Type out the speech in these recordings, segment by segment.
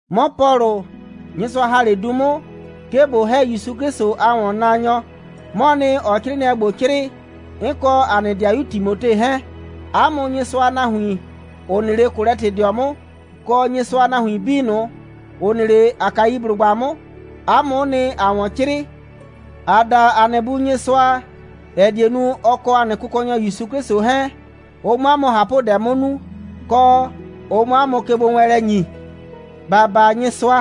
'Mɔ Pɔlʋ, Nyɩsʋa ‑ha 'le du 'mʋ, 'ke ꞊bo ‑hɛ ‑Yusu 'Klɩsʋ a ‑wɔnnaanyɔ, 'mɔɔ nɩ, ‑ɔɔ 'crɩɩnɩɛ ‑gbo 'crɩɩ, 'n kɔ ‑a nɩ 'dɩayu Timote 'hɛɛn. 'A mʋ Nyɩsʋa a nahuin, ‑ʋ nɩ 'le Kolɛtɩdɩɔ 'mʋ, kɔ Nyɩsʋa a nahuin 'bii ꞊nʋ, ‑ʋ nɩ 'le Akaiblʋgba 'mʋ, 'a mʋ'ʋ nɩ, ‑aa ‑wɔn 'crɩɩ. ‑Aa da ‑a nɩ Bu Nyɩsʋa, ‑ɛ die nu, ɔ kɔ ‑a nɩ Kʋkɔnyɔ ‑Yusu 'Klɩsʋ 'hɛɛn, ʋ 'mʋ 'a mʋ ꞊hapʋdɛ 'mʋ nu, kɔ, ʋ 'mʋ 'a mʋ kegbowɛɛnlɛ ‑nyi. ‑Ba baa Nyɩsʋa.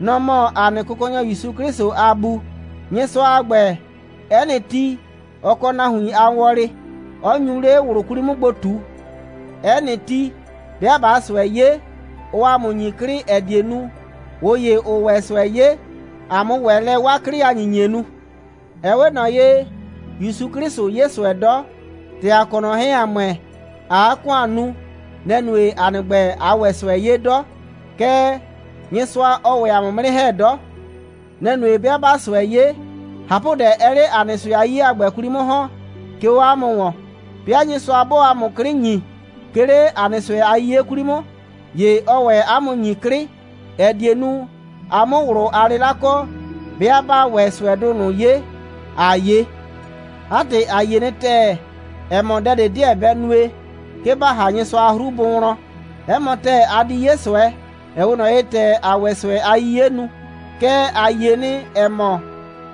Nɔ‑ mɔ ‑a nɩ Kʋkɔnyɔ ‑Yusu 'Klɩsʋ a Bu. Nyɩsʋa a ‑gbɛ, 'ɛ nɩ ti, ɔ kɔ nahuin a wɔlɩ, 'ɔ nyu 'le ꞊wlʋ 'kwli 'mʋ gbo ꞊tu. 'Ɛ nɩ ti, 'bɩa ꞊baa ꞊sʋɛ 'ye, ɔɔ ‑a mʋ ‑nyi 'klɩ, ‑ɛ die nu, ꞊ʋ ‑ye, ‑ʋʋ ‑wɛ ꞊sʋɛ 'ye, ‑a 'mʋ ‑wɛ lɛ 'waa 'klɩ a ‑nyinyie nu. Ɛ 'we ꞊nɔ ye, ‑Yusu 'Klɩsʋ 'ye ꞊sʋɛ 'dɔ. ‑Tɛ ‑a kɔ ꞊nɔ 'hɛɛn, ‑a ‑mʋɛ, ‑aa 'a ‑kʋan nu, nɛ‑ nue, ‑a nɩ ‑gbɛ, ꞊aa ‑wɛ ꞊sʋɛ 'ye 'dɔ. Kɛɛ, Nyɩsʋa, ɔɔ ‑wɛ ‑a mʋ 'mʋ 'nɩ ‑hɛ 'dɔ. Nɛ‑ nue, 'bɩa ꞊baa ꞊sʋɛ 'ye, ꞊hapʋdɛ 'ɛɛ 'le ‑a nɩ ꞊sʋɛ a 'yiye a ‑gbɛ 'kwli 'mʋ ‑hɔn, 'ke 'o 'a mʋ ‑wɔn. 'Bɩa Nyɩsʋa 'bɔɔ ‑a mʋ 'klɩ ‑nyi, 'ke 'le ‑a nɩ ꞊sʋɛ a 'yiye 'kwli 'mʋ, ‑ye ɔɔ ‑wɛ 'a mʋ ‑nyi 'klɩ, ‑ɛ die nu, a 'mʋ ꞊wlʋ a 'lɩla kɔ, 'bɩa 'baa ‑wɛ ꞊sʋɛdʋ ꞊nʋ 'ye, ‑aa 'ye. 'A ‑tɩ, ‑a yie nɩ ‑tɛɛ, ‑ɛ mɔ, dɛ ꞊de 'deɛ bɛ nue, 'ke ba ‑ha Nyɩsʋa a 'hru bʋ wlɔn. 'Ɛ mɔ ‑tɛɛ, a di 'ye ꞊sʋɛ, ‑ɛ 'we ꞊nɔ ye, ‑tɛ ‑aa ‑wɛ ꞊sʋɛ a 'yiye nu, kɛɛ, ‑a yie nɩ, ‑ɛ mɔ,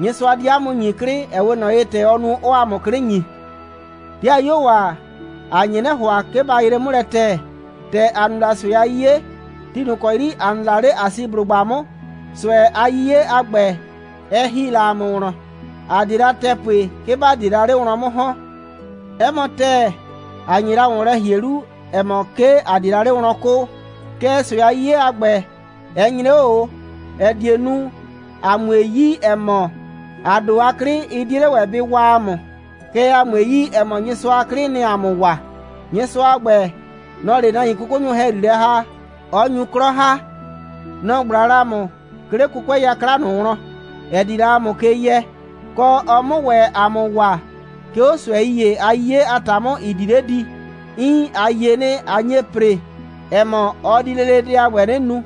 Nyɩsʋa di 'a mʋ ‑nyi 'klɩ, ‑ɛ 'we ꞊nɔ ye, ‑tɛ ɔɔ nu, 'ɔɔ ‑a mʋ 'klɩ ‑nyi. 'Dɩayuo ‑a, ‑a nye 'nɩ ‑hʋa, 'ke ba yree 'mʋ lɛ ‑tɛɛ, ‑tɛ ‑a nu la ꞊sʋɛ a 'yiye, ti ꞊nʋ ‑kɔ 'yri ‑a nɩ la 'le Asiblʋgba 'mʋ. ꞊Sʋɛ a 'yiye a ‑gbɛ, ɛ ‑hi la ‑a mʋ wlɔn. ‑A 'die la ‑tɛɛ pue, 'ke ‑ba die la 'le wlɔn 'mʋ ‑hɔn. 'Ɛ mɔ ‑tɛɛ, ‑a nye la ‑wɔn lɛ ‑hie 'lu, ‑ɛ mɔ, 'ke ‑a die la 'le wlɔn 'kʋʋ. Kɛɛ, ꞊sʋɛ a 'yiye a ‑gbɛ, ɛ nyre 'o ꞊o, ‑ɛ die nu, ‑a 'mue yi, ‑ɛ mɔ, ‑a ‑do a 'klɩ, ɩ 'die 'le ‑wɛ, bɩ waa ‑a mʋ, kɛɛ, ‑a 'mue yi, ‑ɛ mɔ, Nyɩsʋa a 'klɩ, nɩ‑ɩ ‑a mʋ waa. Nyɩsʋa a ‑gbɛ, nɔ‑ɔ 'le nahuin 'kʋkʋnyʋ ‑hɛyri ‑ha, 'ɔ nyu 'klɔ ‑ha. Nɔ‑ ꞊gbla la ‑a mʋ, 'ke 'le 'kʋkʋɛ 'yakla ꞊nʋ wlɔn, ‑ɛ di la ‑a mʋ ke yɛ, kɔ, ɔ 'mʋ ‑wɛ ‑a mʋ waa, 'ke 'o ꞊sʋɛi ‑ye a 'yiye a ‑ta 'mʋ, ‑ɩ di 'le di. Iin, ‑a yie nɩ, ꞊a nye ‑pre, ‑ɛ mɔ, ɔ di lele dɛ a ‑gbɛ 'nɩ nu.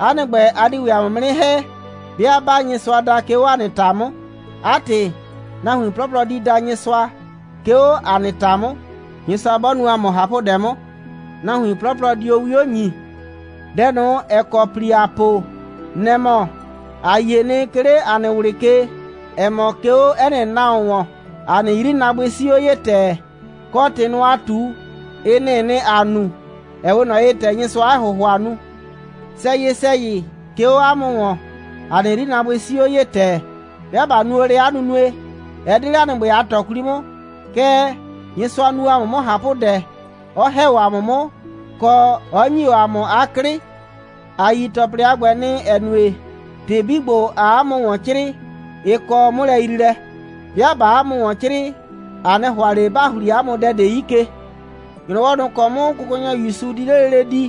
'A nɩ ‑gbɛ, a di ‑wɛ ‑a mʋ 'mʋ 'nɩ ‑hɛ, 'bɩa 'baa Nyɩsʋa da, 'ke 'o ‑a nɩ ‑ta 'mʋ. 'A ‑tɩ, nahuin 'plɔplɔ di da Nyɩsʋa, 'ke 'o ‑a nɩ ‑ta 'mʋ. Nyɩsʋa 'bɔ nu ‑a mʋ ꞊hapʋdɛ 'mʋ, nahuin 'plɔplɔ dio 'wio ‑nyi. Dɛ ꞊nʋ, ‑ɛ kɔ ‑pli ‑aa po, nɛ‑ mɔ: ‑A yie nɩ, 'ke 'le ‑a nɩ ꞊wlɩ ke, ‑ɛ mɔ, 'ke 'o 'ɛ nɩ nahuon ‑wɔn, ‑a nɩ 'yrinaabʋɩ 'sii 'o ye ‑tɛɛ, kɔ, ‑tɩ ꞊nʋ, ‑aa ꞊tu, ɩ nɩ‑ɩ nɩ, ‑aa nu, ‑ɛ 'we ꞊nɔ ye, ‑tɛ Nyɩsʋaa 'a ‑hʋhʋa nu. Sɛyɩ‑sɛyɩ, 'ke 'o 'a mʋ ‑wɔn, ‑a nɩ 'yrinaabʋɩ 'sii o 'o ye ‑tɛɛ. 'Bɩa ꞊ba nu o lɛ 'a nunue, ɛ 'de 'le ‑a nɩ ‑gbɛ a ꞊tɔ 'kwli 'mʋ, kɛɛ, Nyɩsʋa nu o ‑a mʋ 'mʋ ꞊hapʋdɛ, 'ɔ ‑hɛ o ‑a mʋ 'mʋ, kɔ, 'ɔ ‑nyi o ‑a mʋ 'a 'klɩ. A yi ‑tɔplɩ a ‑gbɛ nɩ, ‑ɛ nue, ‑tɩ 'bii ‑gbo, ‑aa 'a mʋ ‑wɔn 'crɩɩ, ɩ kɔ 'mʋlɛyriilɛ. 'Bɩa ꞊baa 'a mʋ ‑wɔn 'crɩɩ, ‑a 'nɩ ‑hʋa ꞊le ‑ba ‑hli 'a mʋ dɛ ꞊de 'yi ke. ‑Nyrɔwɔ ꞊nʋ ‑kɔ 'mʋ Kʋkɔnyɔ ‑Yusu di 'le lele di,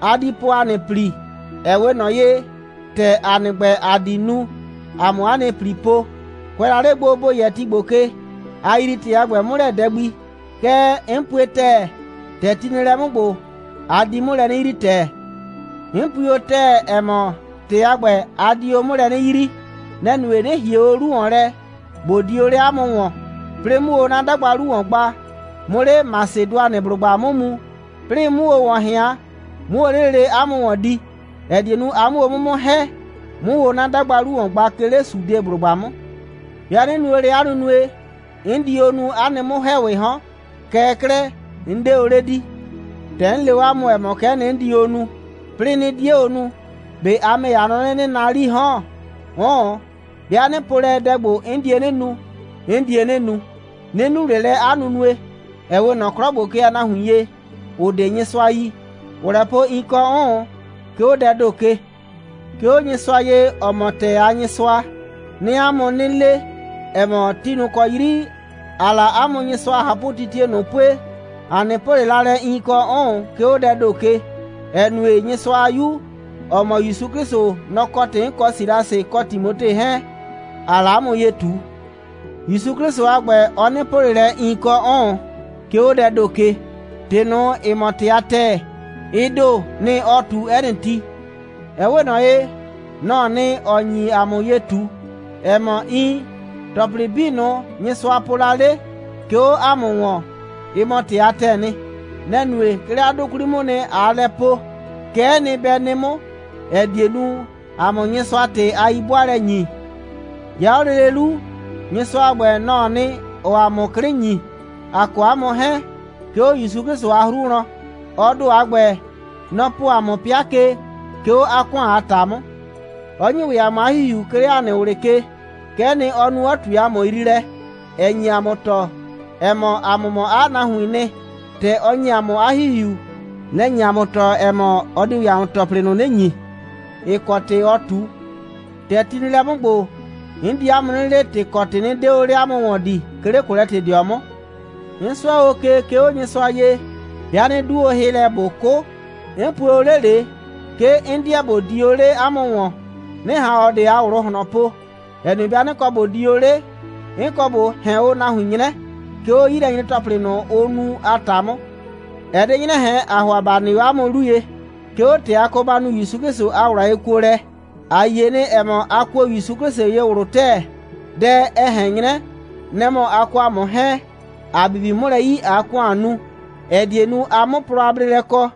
a di po ‑a nɩ ‑pli, ‑ɛ 'we ꞊nɔ ye, ‑tɛ ‑a nɩ ‑gbɛ, ‑a di nu, ‑a 'mʋ 'a nɩ ‑pli po. Kʋɛ la 'le gbo, ‑bo yɛ ti ‑gbo ke, a yrii ‑tɩ a ‑gbɛ 'mʋ lɛ dɛ gbi. Kɛɛ, 'n pue ‑tɛɛ, ‑tɛ ti nɩ lɛ 'mʋ ‑gbo, a di 'mʋ lɛ 'nɩ yrii ‑tɛɛ. 'N pui o ‑tɛɛ, ‑ɛ mɔ, ‑tɩ a ‑gbɛ, a di o 'mʋ lɛ 'nɩ yrii. Nɛ‑ nue, 'nɩ ‑hie o 'lu ‑wɔn lɛ, ꞊bo di o 'le 'a mʋ ‑wɔn, 'plɩɩ 'mʋ o 'na 'dagba 'lu ‑wɔn gba, 'mʋ 'le Masɩdʋanɩblʋgba 'mʋ mu, 'plɩɩ 'mʋ o ‑wɔn ꞊hɩan, 'mʋ o 'le lele 'a mʋ ‑wɔn di, ‑ɛ die nu, a 'mʋ o 'mʋ 'mʋ ‑hɛ, 'mʋ o 'na 'dagba 'lu ‑wɔn gba, 'ke 'le Sudeblʋgba 'mʋ. 'Bɩa 'nɩ nu o lɛ 'a nunue, 'n di o nu 'a nɩ 'mʋ‑hɛɛwɩɩ 'hɔn. Kɛɛ 'klɛɛ, 'n 'de o 'le di. ‑Tɛ 'n le o 'a mʋ, ‑ɛ mɔ, kɛ'ɛ nɩ, 'n di o nu, 'plɩɩ 'nɩ 'die o nu, ꞊be a ‑mɛ ‑ye, a nɔ 'nɩ, 'nɩɩ naa 'lii 'hɔn? 'Ʋʋn, 'bɩa 'nɩ po lɛ, dɛ ‑gbo, 'n die 'nɩ nu, 'n die 'nɩ nu. 'Nɩ nu ꞊le lɛ 'a nunue, ‑ɛ 'we ꞊nɔ 'klɔ ‑gbo ke a nahuin ye, ‑ʋ 'de Nyɩsʋa yi, ‑ʋʋ lɛ po iin kɔ 'ʋʋn, 'ke 'o dɛɛ ‑do ke. 'Ke 'o Nyɩsʋa ye, ‑ɔ mɔ ‑tɛɛ a Nyɩsʋa, 'nɩɩ 'a mʋ 'nɩ le, ‑ɛ mɔ, ti ꞊nʋ ‑kɔ 'yri ‑aa la 'a mʋ Nyɩsʋa a ꞊hapʋtitie ꞊nʋ pue, ‑a 'nɩ po ꞊le la lɛ, iin kɔ 'ʋʋn, 'ke 'o dɛɛ ‑do ke, ‑ɛ nue, Nyɩsʋa a 'Yu, ‑ɔ mɔ ‑Yusu 'Klɩsʋ, nɔ‑ kɔ ‑tɩ 'n kɔ Silasɩ, kɔ Timote 'hɛɛn, ‑aa la 'a mʋ ye ꞊tu. ‑Yusu 'Klɩsʋ a ‑gbɛ, ɔ 'nɩ po ꞊le lɛ iin kɔ 'ʋʋn, 'ke 'o dɛɛ ‑do ke. ‑Tɩ ꞊nʋ, ‑ɩ mɔ ‑tɩ a ‑tɛɛ, ɩ ‑do, nɩ‑ ɔɔ ꞊tu 'ɛ nɩ ti. Ɛ 'we ꞊nɔ ye, nɔ‑ɔ nɩ, ‑ɔ nyi ‑a mʋ ye ꞊tu, ‑ɛ mɔ, iin, ‑tɔplɩ 'bii ꞊nʋ, Nyɩsʋa po la 'le, 'ke 'o ‑a mʋ ‑wɔn, ɩ mɔ ‑tɩ a ‑tɛɛ nɩ. Nɛ‑ nue, 'ke 'le 'a 'dʋ 'kwli 'mʋʋ nɩ, ꞊aa lɛ po: Kɛ'ɛ nɩ, bɛ nɩ 'mʋ, ‑ɛ die nu, ‑a 'mʋ Nyɩsʋa ‑tɩ a 'yi'bʋaalɛ ‑nyi. 'Ya 'o lele 'lu, Nyɩsʋa a ‑gbɛ, nɔ‑ɔ nɩ, ‑ɔɔ ‑a mʋ 'klɩ ‑nyi, ‑a kɔ 'a mʋ 'hɛɛn, 'ke 'o ‑Yusu 'Klɩsʋ a 'hru wlɔn. Ɔ ‑do a ‑gbɛ, nɔ‑ po ‑a mʋ 'pɩa ke, 'ke 'o 'a ‑kʋan a ‑ta 'mʋ; 'ɔ ‑nyi ‑wɛ ‑a mʋ 'a ‑Hihiu, 'ke 'le ‑a nɩ ꞊wlɩ ke. Kɛ'ɛ nɩ, ɔ nu, 'ɔ ꞊tue ‑a mʋ yriilɛ, ‑ɛ nye ‑a mʋ tɔɔ, ‑ɛ mɔ, ‑a mʋ mɔ 'a nahuiin nɩ. ‑Tɛ ɔ ‑nyi ‑a mʋ 'a ‑Hihiu, nɛ‑ nye ‑a mʋ tɔɔ, ‑ɛ mɔ, ɔ di ‑wɛ ‑a mʋ ‑tɔplɩ ꞊nʋ 'nɩ ‑nyi, ‑ɩ kɔ ‑tɩ ɔ ꞊tu. ‑Tɛ ti nɩ lɛ 'mʋ ‑gbo, 'n di 'a mʋ 'nɩ le, ‑tɩ kɔ ‑tɩ 'nɩ 'de o 'le 'a mʋ ‑wɔn di, 'ke 'le Kolɛtɩdɩɔ 'mʋ. 'N 'sʋɛ ke, 'ke 'o Nyɩsʋa ye, 'bɩa 'nɩ 'du hɩ, ꞊bo 'kʋ: 'n pue o 'le ꞊le, 'ke 'n 'deɛ ꞊bo di o 'le 'a mʋ ‑wɔn, 'nɩ ꞊han ꞊ɔ ꞊de a ꞊wlʋ ꞊hlɔn po, ‑ɛ nue, 'bɩa 'nɩ kɔ ꞊bo di o 'le, 'n kɔ ꞊bo ꞊hɛn o nahuin 'nyrɛ, 'ke 'o 'yilɛnyre‑tɔplɩ ꞊nʋ, ʋ nu a ‑ta 'mʋ. Ɛ 'de 'nyrɛ ꞊hɛn, ‑aa ‑hʋa ‑ba nɩ 'o 'a mʋ 'lu ye, 'ke 'o ‑tɛ a kɔ ba nu ‑Yusu 'Klɩsʋ a ꞊wlʋ a yekuolɛ. ‑A yie nɩ, ‑ɛ mɔ, a kuo ‑Yusu 'Klɩsʋ ye ꞊wlʋ ‑tɛɛ. Dɛ, ɛ ꞊hɛn 'nyrɛ, nɛ‑ mɔ, a kɔ ‑a mʋ 'hɛɛn, ‑a bibi 'mʋ lɛ 'yi, ꞊aa ‑kʋan nu, ‑ɛ die nu, a 'mʋ plɔ a bleelɛ kɔ.